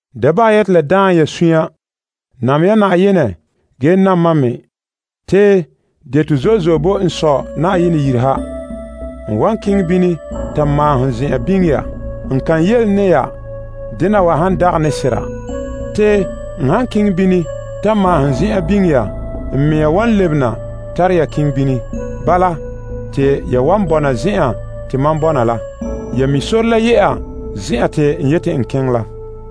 Da bahɛ ya te la daam ya sunya. Nam ya Na'ayenɛ ge nam mam me. Te deto zo'e zo'e boe n Sɔ Na'ayenɛ yire ha. N wan keŋɛ bini ta maahom zen'an biŋe ya. N kan yele ne ya dena wa han dagɛ ne sera. Te n han keŋɛ bini ta maahom zen'an biŋe ya, n mea wan lebena tara ya keŋɛ bini. Bala, te ya wan bɔna zen'an te mam bɔna la. Ya mi' sore la ye'a zen'an te n yeti n keŋɛ la.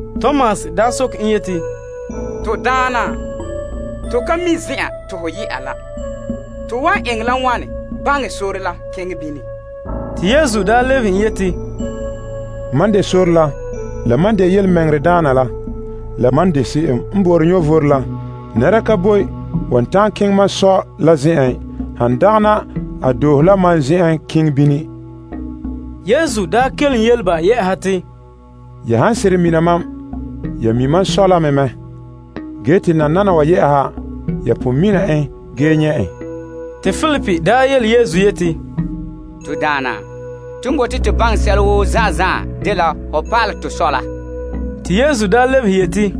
Te Tomas soke en yeti, To Daana, to ka mi' zen'an te ho ye'a la. To wan eŋɛ la wane baŋɛ sore la keŋɛ bini? Te Yesu lebehe en yeti, Mam n de sore la, dɛna yelemɛŋɛrɛdaana la, ge dɛna vom daana la. Nɛra ka boe wan ta'an keŋɛ mam Sɔ la zen'en, han dagana, a doohe la mam zen'en keŋɛ bini. Yesu kelom yele ba te, Ya han seren mina mam, ya me mi' mam Sɔ la mɛ. Ge nananawa, ya mi' en ge pon nyɛta en. Te Filip yele Yesu yeti, To Daana, ton bote to baŋɛ sɛla woo zan'an zan'an dela ho pa'alɛ tɔ Sɔ la. Te Yesu lebehe yeti,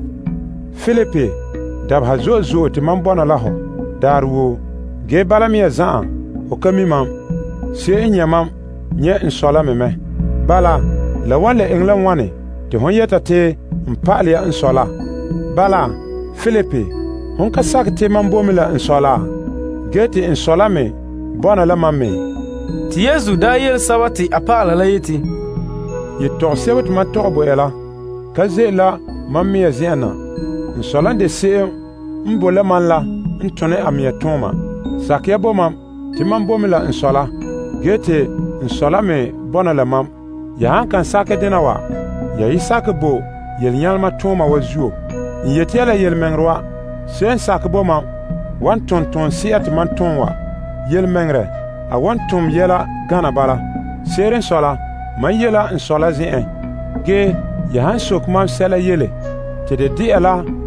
Filip, dabeha zo'e zo'e te mam bɔna la hɔ daarɛ woo. Ge bala mea zan'an, ho ka mi' mam. Se'em n nyɛ' mam, nyɛ' n Sɔ la me mɛ. Bala, la wan le eŋɛ la wane te hon yɛta te n pa'alɛ ya n Sɔ laa? Bala, Filip, ho ka sakɛ te mam bo mɛ la n Sɔ la ge te n Sɔ la me bɔna la mam me? Te Yesu yele a dɔlɔba la yeti, Yetɔgom sebo te mam tɔgɛ bo ya la, ka ze'ele la mam mea zen'en na. N Sɔ la n de se'em n bo la mam la n tone a mea tooma. Sakɛ ya bo mam, te mam boe mɛ la n Sɔ la, ge te n Sɔ la me bɔna la mam. Ya han kan sakɛ dena wa, ya yi sakɛ bo yelenyalema ton'ana wa zuo. N yeti ya la yelemɛŋɛrɛ wa, se'em n sakɛ bo mam wan tom toonse'a te mam tom wa. Yelemɛŋɛrɛ, a wan tom yɛla gana bala. Se'ere n sɔe la, mam ye la n Sɔ la zen'en. Ge ya han soke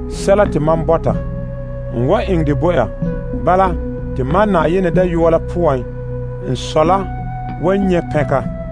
sɛla woo mam yu'urɛ poan, n wan eŋɛ dɛ bo ya. Bala, te n Sɔ la wan nyɛ' pɛnka.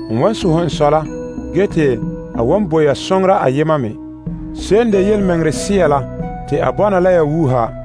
N wan sohɛ n Sɔ la ge te a wan bo ya Soŋora ayema me, te a bɔna la ya wuuha.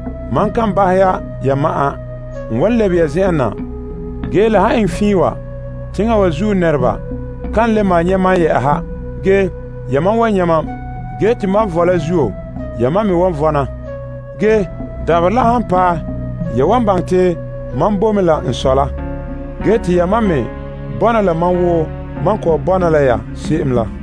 Mam kan bahɛ ya ya ma'an. N wan lebe ye zen'en na. Ge la han eŋɛ fiin wa, teŋa wa zuo nɛreba kan le malom nyɛ' mam. Ge yamam wan nyɛ' mam, ge te mam vɔe la zuo, yamam me wan vɔna. Ge dabaherɛ la han paɛ, ya wan baŋɛ te mam boe mɛ la n Sɔ la. Ge te yamam me bɔna la mam wo mam kɔ'ɔn bɔna la ya se'em la.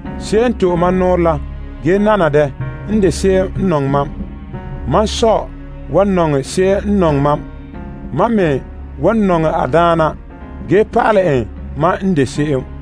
Se'em n to'e mam nɔɔrɛ la ge nana dɛ n de se'em n nɔŋɛ mam. Mam Sɔ wan nɔŋɛ se'em n nɔŋɛ mam. Mam me wan nɔŋɛ a daana ge pa'alɛ en mam n de se'em.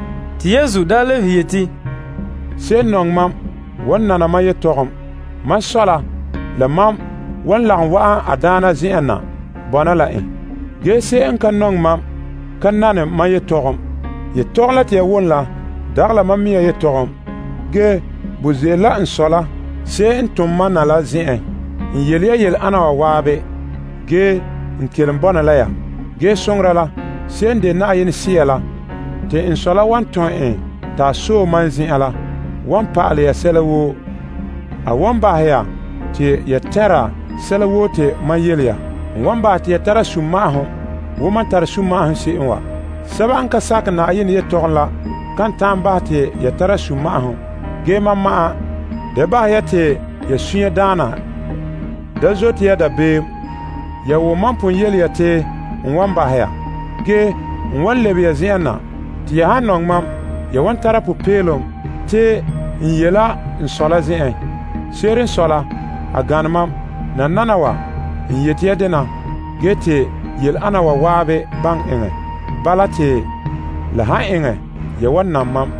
Te Yesu daa lebehe yeti, Se'em n nɔŋɛ mam wan nana mam pa'alegɔ la. Mam Sɔ la, la mam wan lagom wa'an a daana zen'en na bɔna la en. Ge se'em n ka nɔŋɛ mam ka nane mam pa'alegɔ la. Pa'alegɔ la te ya wom la dagɛ la mam mea pa'alegɔ. Ge, bo ze'ele la n Sɔ la, se'em n tom mam na la zen'en. N yele ya yele ana wa zan'an ge n kelom bɔna la ya wa. Ge Soŋora la, se'em n de Na'ayenɛ Sea la te n Sɔ la wan tom en ta sɔe mam zen'en la, wan pa'alɛ ya sɛla woo. A wan bahɛ ya te ya tɛnra sɛla woo te mam yele ya. N wan bahɛ te ya tara sunma'ahom wo mam tara sunma'ahom se'em wa. Sɛba n ka sakɛ Na'ayenɛ yelehom la kan ta'an bahɛ te ya tara sunma'ahom, ge mam ma'an. Da bahɛ ya te ya sunya daana. Da zote ya dabeem. Ya wom mam pon yele ya te n wan bahɛ ya. Ge, n wan lebe ya zen'en na. Te ya han nɔŋɛ mam, ya wan tara popeelom te n ye' la n Sɔ la zen'en. Se'ere n sɔe la, a gane mam. Nananawa, n yeti ya dena, ge te yele ana wa zan'an baŋɛ eŋɛ. Bala, te la han eŋɛ, ya wan nam mam.